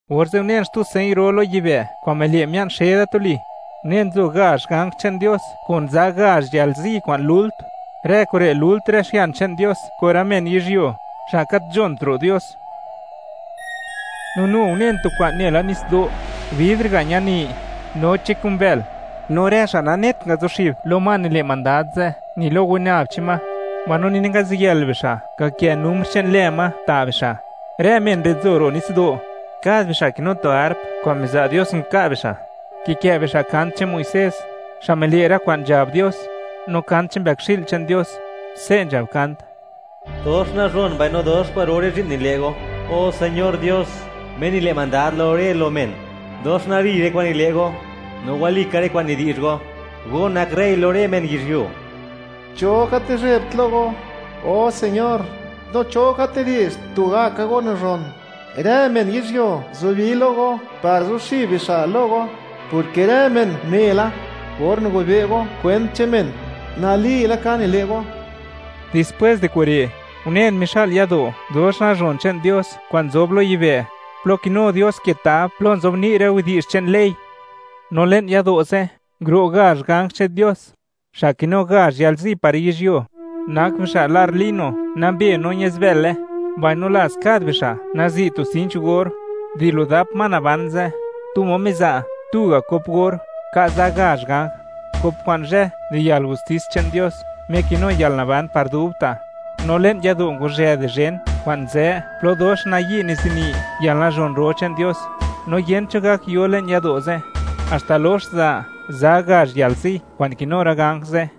Orze' unen xtu señ ro lo yibë' kwa'n mile' mia'n xe da tuli; unen nzo gazh ganj che'n Dios kun za gazh yalzi kwa'n lult; rë kure' lult rë xian che'n Dios kun rë men yizhyuo, xa' gat nzhont ro' Dios. No nu unen tu kwa'n nela nitsdo', bidr ga' ñani, noche kun bël, no rë xa' nanet ngazuxib lo ma nile' mandad ze', ni lo winab che'n ma, mbaino ni nangaziyël bixa' ngakë numr che'n lë ma ta' bixa'; rë men re' nzo ro' nitsdo', kad bixa' kinu tu harp kwa'n miza' Dios nka' bixa'. Kikë' bixa' kant che'n Muisés, xa' mile' rë kwa'n nzhab Dios, no kant che'n Mbëkxi'l che'n Dios; se' nzhab kant: Dox nazhon mbaino dox kwa'ro rë zhi'n nile' Go, o Señor Dios, Me nile' mandad lo rë lo men. Dox nali rë kwa'n nile' Go, no wali ka rë kwa'n nidi'zh Go, Go nak rey lo rë men yizhyuo. ¿Cho gat nizhebt lo Go, o Señor? No, ¿cho gat nidi'zh, tugaka Go nazhon? Rë men yizhyuo zubi lo Go par zuxib bixa' lo Go, porke rë men une la, or nigobe' Go kwent che'n men, nali laka nile' Go. Dispwés di kure', unen mixa'l yado' dox nazhon che'n Dios kwa'n nzob lo yibë', plo kinu Dios ke tab plo nzobni' rë widi'zh che'n ley. No le'n yado' ze', nguro' gazh ganj che'n Dios, xa' kinu gazh yalzi par yizhyuo. Nak bixa' lar lino nambe no ñazbële, mbaino laz kad bixa' nazi' tu sinch gor. Di lo dap ma naban ze', tu ma miza' tu ga' kop or, ka' za gazh ganj, kop kwa'n zhë di yalgustis che'n Dios Me kinu yalnaban par dubta'. No le'n yado' ngwazhë di zhen kwa'n nzë plo dox nayi' nizini yalnazhon ro che'n Dios, no yent cho gak yo le'n yado' ze', haxta lox za, za gazh yalzi kwa'n kinu rë ganj ze'.